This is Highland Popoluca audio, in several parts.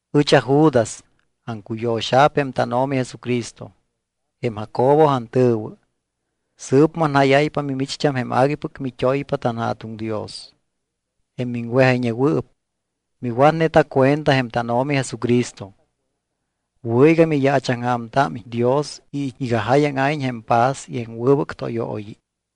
Ɨch aJudas aŋcuyo̱xa̱p jém tánO̱mi Jesucristo. Jém Jacobo antɨ̱wɨ. Sɨɨp manjáyáypa mimicht́am jém aguipɨc mit́oypa tanJa̱tuŋ Dios, jém miŋwejayñewɨɨp. Miwatneta cuenta jém tánO̱mi Jesucristo. Wɨ̱ iga miyaachaŋja̱mtámiñ Dios y iga jáyaŋa̱iñ jém paz y jém wɨbɨc tóyooyi.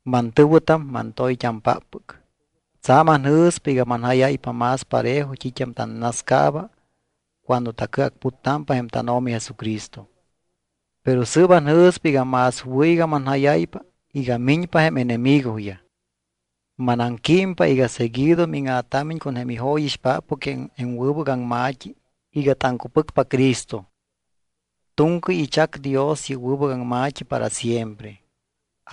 Mantɨ̱wɨtam, mantoyt́ampáppɨc, tsa̱m anjɨ̱spa iga manjáyáypa más parejo t́it́am tannascaaba cuando tacɨacputtámpa jém tánO̱mi Jesucristo. Pero sɨɨp anjɨ̱spa iga más wɨ̱ iga manjáyáypa iga miñpa jém enemigoyaj. Manaŋquímpa iga seguido míŋa̱támiñ con jém ijóyixpáppɨc jém wɨbɨc aŋma̱t́i iga taŋcupɨcpa Cristo. Tu̱ŋcɨy ichac Dios yɨ́p wɨbɨc aŋma̱t́i para siempre.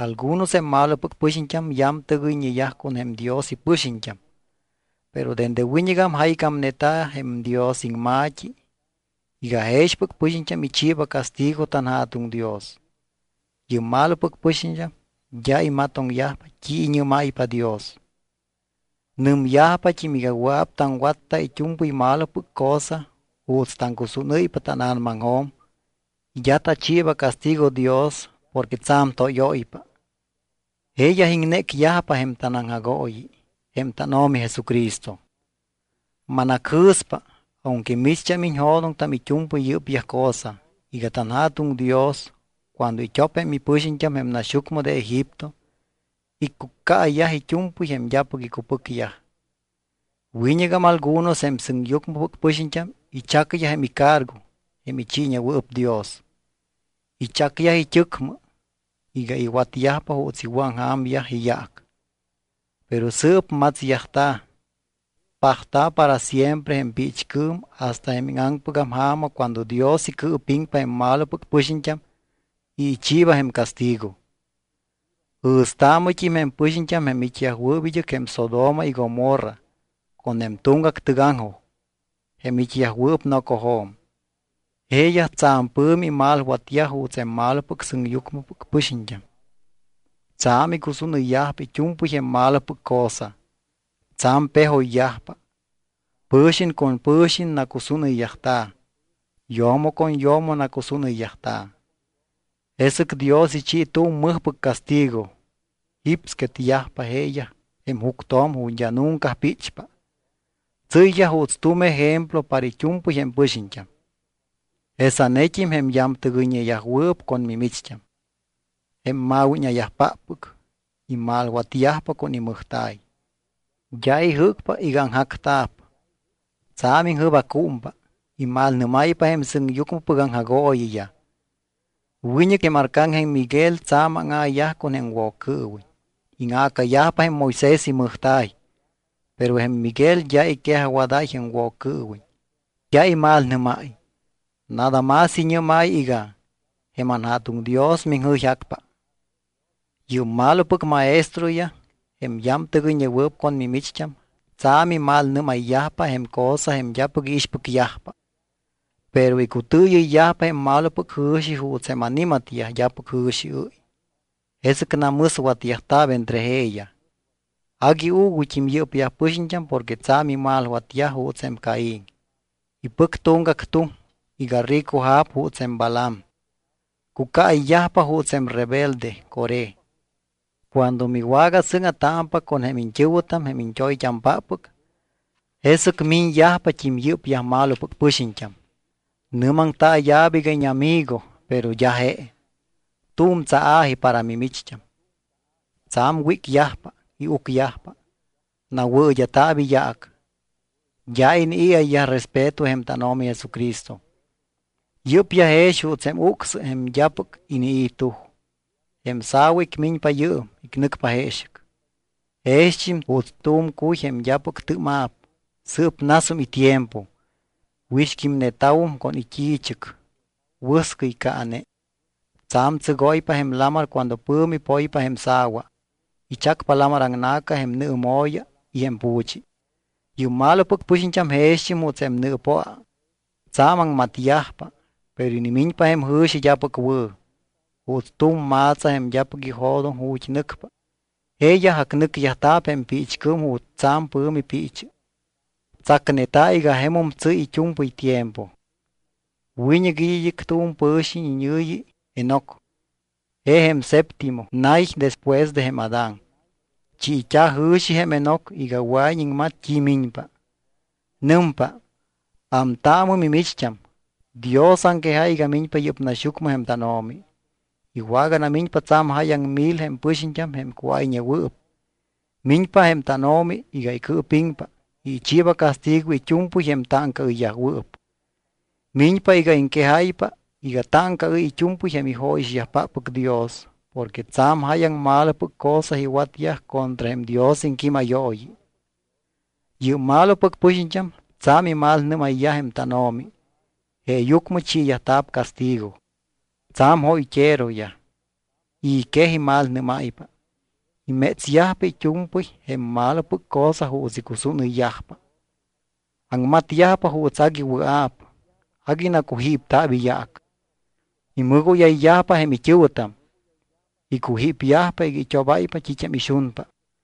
Algunos jém malopɨc pɨxiñt́am yamtɨgɨyñeyaj con jém Dios ipɨxiñt́am. Pero dende wiñɨgam jaycámneta̱ jém Dios iŋma̱t́i iga jexpɨc pɨxiñt́am ichiiba castigo tanJa̱tuŋ Dios. Yɨ́p malopɨc pɨxiñt́am d́a imatoŋyajpa t́i iñɨ́máypa Dios. Nɨmyajpat́im iga wɨa̱p taŋwatta it́u̱mpɨy malopɨc cosa juuts taŋcusúnɨ́ypa tána̱namaŋjo̱m y d́a tachiiba castigo Dios porque tsa̱m tóyóypa. Jeeyaj iŋnécyajpa jém tanAŋjagooyi, jém tánO̱mi Jesucristo. Manacjɨ̱spa, aunque micht́am iñjo̱doŋtam it́u̱mpɨy yɨ́pyaj cosa, iga tanJa̱tuŋ Dios cuando it́op jém ipɨxiñt́am jém naxyucmɨ de Egipto, iccucaayyaj it́u̱mpɨy jém d́apɨc icupɨcyaj. Wiñɨgam algunos jém sɨŋyucmɨpɨc pɨxiñt́am ichacyaj jém icargo jém ichiiñewɨɨp Dios. Ichacyaj it́ɨcmɨ iga iwatyajpa juuts iwɨ̱aŋja̱myaj iyaac. Pero sɨɨp matsyajta̱, pajta̱ para siempre jém piichcɨɨm hasta jém íŋaŋpɨgam ja̱ma cuando Dios icɨɨpiŋpa jém malopɨc pɨxiñt́am y ichiiba jém castigo. Jɨ̱staamɨt́im jém pɨxiñt́am jém it́yajwɨɨp id́ɨc jém Sodoma y Gomorra con jém tuŋgac tɨgaŋjoj, jém it́yajwɨɨp nocojo̱m. Jeeyaj tsa̱m pɨ̱mi imalwatyaj juuts jém malopɨc sɨŋyucmɨpɨc pɨxiñt́am. Tsa̱m icusúnɨyyajpa it́u̱mpɨy jém malopɨc cosa. Tsa̱m pejoyyajpa. Pɨ̱xiñ con pɨ̱xiñ nacusúnɨyyajta̱. Yo̱mo con yo̱mo nacusúnɨyyajta̱. Jesɨc Dios ichi tu̱m mɨjpɨc castigo. Jipsquetyajpa jeeyaj jém juctjo̱m ju̱t́ d́a nunca píchpa. Tsɨ́yyaj juuts tu̱m ejemplo para it́u̱mpɨy jém pɨxiñt́am. Jesanet́im jém yamtɨgɨyñeyajwɨɨp con mimicht́am, jém ma̱wíña̱yajpáppɨc, imalwatyajpa con imɨjta̱y. D́a ijɨ́cpa iga aŋjacta̱p. Tsa̱m iŋjɨbaccúmpa, imalnɨ́máypa jém sɨŋyucmɨpɨc aŋjagooyiyaj. Wiñɨc jém arcángel Miguel tsa̱m áŋa̱yaj con jém Woccɨɨwiñ, íŋa̱cayajpa jém Moisés imɨjta̱y. Pero jém Miguel d́a iquejajwadáy jém Woccɨɨwiñ, d́a imalnɨ́máy, nada más iñɨ́máy iga: Jém anJa̱tuŋ Dios miŋjɨyjácpa. Yɨ́p malopɨc maestroyaj, jém yamtɨgɨyñewɨɨp con mimicht́am, tsa̱m imalnɨ́mayyajpa jém cosa jém d́apɨc iixpɨcyajpa. Pero icutɨɨyɨyyajpa jém malopɨc jɨ̱xi juuts jém ani̱matyaj d́apɨc jɨ̱xiɨ́y. Jesɨc namɨswatyajta̱p entre jeeyaj. Agui uuguyt́im yɨ́pyaj pɨxiñt́am porque tsa̱m imalwatyaj juuts jém Caín. Ipɨc tuŋgac tuŋ iga ricoja̱p juuts jém Balaam. Cucaayyajpa juuts jém rebelde Coré. Cuando miwagasɨ́ŋa̱támpa con jém iñt́ɨ̱wɨtam, jém iñt́oyt́ampáppɨc, jesɨc miñyajpat́im yɨ́pyaj malopɨc pɨxiñt́am. Nɨ́maŋtaaya̱p iga íñamigo, pero d́a je. Tu̱m tsaa̱ji para mimicht́am. Tsa̱m wícyajpa y ucyajpa. Nawɨɨd́a̱ta̱p iyaac. D́a inii̱ayyaj respeto jém tánO̱mi Jesucristo. Yɨ́pyaj jex juuts jém ucsɨ jém d́apɨc inii̱ tuj, jém sa̱wa icmiñpa yɨɨm, icnɨcpa jeexɨc. Jext́im juuts tu̱m cuy jém d́apɨc tɨ́ma̱p y sɨɨp nasum itiempo, wixquímneta̱wum con it́i̱chɨc, wɨscɨy caane. Tsa̱m tsɨgóypa jém lamar cuando pɨ̱mi poypa jém sa̱wa. Ichacpa lamar aŋna̱ca jém nɨɨmo̱ya y jém pu̱chi. Yɨ́p malopɨc pɨxiñt́am jext́im juuts jém nɨɨpoa. Tsa̱m aŋmatyajpa, pero inimiñpa jém jɨ̱xi d́apɨc wɨ̱. Juuts tu̱m ma̱tsa jém d́apɨc ijo̱doŋ ju̱t́ nɨcpa, jeeyaj acnɨcyajta̱p jém piichcɨɨm ju̱t́ tsa̱m pɨ̱mi piichɨ. Tsacneta̱ iga jemum tsɨ́y it́u̱mpɨy tiempo. Wiñɨc it́ id́ɨc tu̱m wɨbɨc pɨ̱xiñ iñɨ̱yi Enoc. Je jém septimo nay despues de jém Adán. Chiit́a̱ jɨ̱xi jém Enoc iga wɨa̱iñ iŋmat t́i miñpa. Nɨmpa: “Ámtaamɨ mimicht́am, Dios aŋquejáy iga miñpa yɨ́p naxyucmɨ jém tánO̱mi. Iwaganamiñpa tsa̱m jáyaŋ mil jém ipɨxiñt́am jém cuáyñeyajwɨɨp. Miñpa jém tánO̱mi iga icɨɨpiŋpa y ichiiba castigo it́u̱mpɨy jém táŋcaɨyyajwɨɨp. Miñpa iga iŋquejáypa iga táŋcaɨ́y it́u̱mpɨy jém ijóyixyajpáppɨc Dios porque tsa̱m jáyaŋ malopɨc cosa iwatyaj contra jém Dios iŋquímayooyi. Yɨ́p malopɨc pɨxiñt́am tsa̱m imalnɨ́mayyaj jém tánO̱mi jeeyucmɨ chiiyajta̱p castigo.” Tsa̱m jóyt́eroyaj, i̱ quej imalnɨ́máypa. Imétsyajpa it́u̱mpɨy jém malopɨc cosa juuts icusúnɨyyajpa. Aŋmatyajpa juuts agui wɨa̱p. Agui nacujípta̱p iyaac. Imɨgóyayyajpa jém it́ɨ̱wɨtam, icujípyajpa iga it́obáypa t́it́am ixunpa.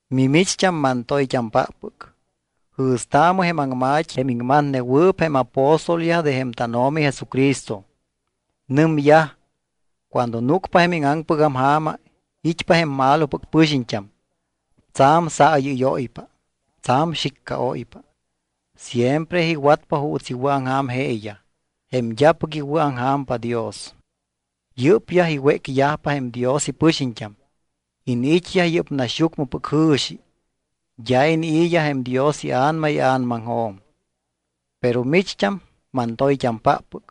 Mimicht́am, mantoyt́ampáppɨc, jɨ̱staamɨ jém aŋma̱t́i, jém iŋmatnewɨɨp jém apóstolyaj de jém tánO̱mi Jesucristo. Nɨmyaj: “Cuando núcpa jém íŋaŋpɨgam ja̱ma, it́pa jém malopɨc pɨxiñt́am. Tsa̱m saayɨ́yóypa, tsa̱m xiccaóypa. Siempre iwatyajpa juuts iwɨ̱aŋja̱m jeeyaj, jém d́apɨc iwɨ̱aŋja̱mpa Dios.” Yɨ́pyaj iwécyajpa jém Dios ipɨxiñt́am. Iniit́yaj yɨ́p naxyucmɨpɨc jɨ̱xi. D́a inii̱yaj jém Dios iA̱nama ia̱namaŋjo̱m. Pero micht́am, mantoyt́ampáppɨc,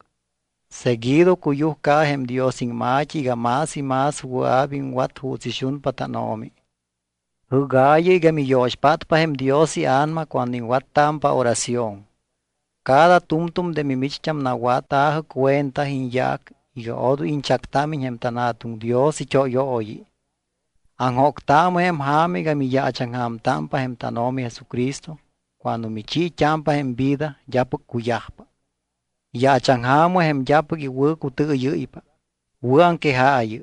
seguido cuyujcaɨ jém Dios iŋma̱t́i iga más y más wɨa̱p iŋwat juuts ixunpa tánO̱mi. Jɨ́gaayɨ iga miyo̱xpátpa jém Dios iA̱nama cuando iŋwattámpa oración. Cada tu̱mtu̱m de mimicht́am nawatta̱jɨ cuenta iñyaac iga odoy iñchactámiñ jém tanJa̱tuŋ Dios it́óyooyi. Aŋjóctaamɨ jém ja̱ma iga miyaachaŋja̱mpa jém tánO̱mi Jesucristo cuando michiit́ámpa jém vida d́apɨc cuyajpa. Yaachaŋja̱mɨ jém d́apɨc iwɨ̱cutɨɨyɨ́ypa. Wɨ̱aŋquejaayɨ.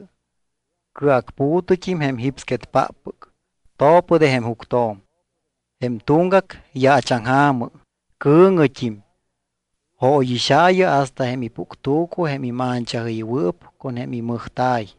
Cɨacpu̱tɨt́im jém jípsquetpáppɨc, to̱pɨ de jém juctjo̱m. Jém tuŋgac, yaachaŋja̱mɨ, cɨ̱ŋɨt́im. Jóyixaayɨ hasta jém ipuctu̱cu jém imanchajɨywɨɨp con jém imɨjta̱y.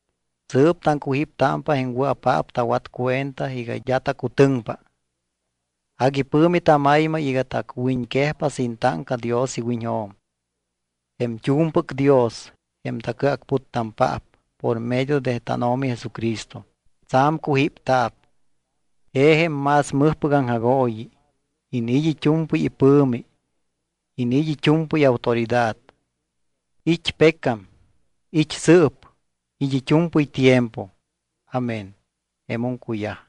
Sɨɨp taŋcujíptámpa jém wɨa̱paap tawat cuenta iga d́a tacutɨŋpa. Agui pɨ̱mi tamaymay iga tacwiñquejpa sin táŋca Dios iwiñjo̱m. Jém t́u̱mpɨc Dios, jém tacɨacputtampaap por medio de tánO̱mi Jesucristo, tsa̱m cujípta̱p. Je jém más mɨjpɨc aŋjagooyi. Iniit́ it́u̱mpɨy ipɨ̱mi. Iniit́ it́u̱mpɨy autoridad. It́ pecam, it́ sɨɨp, it́ it́u̱mpɨy tiempo. Amén. Jemum cuyaj.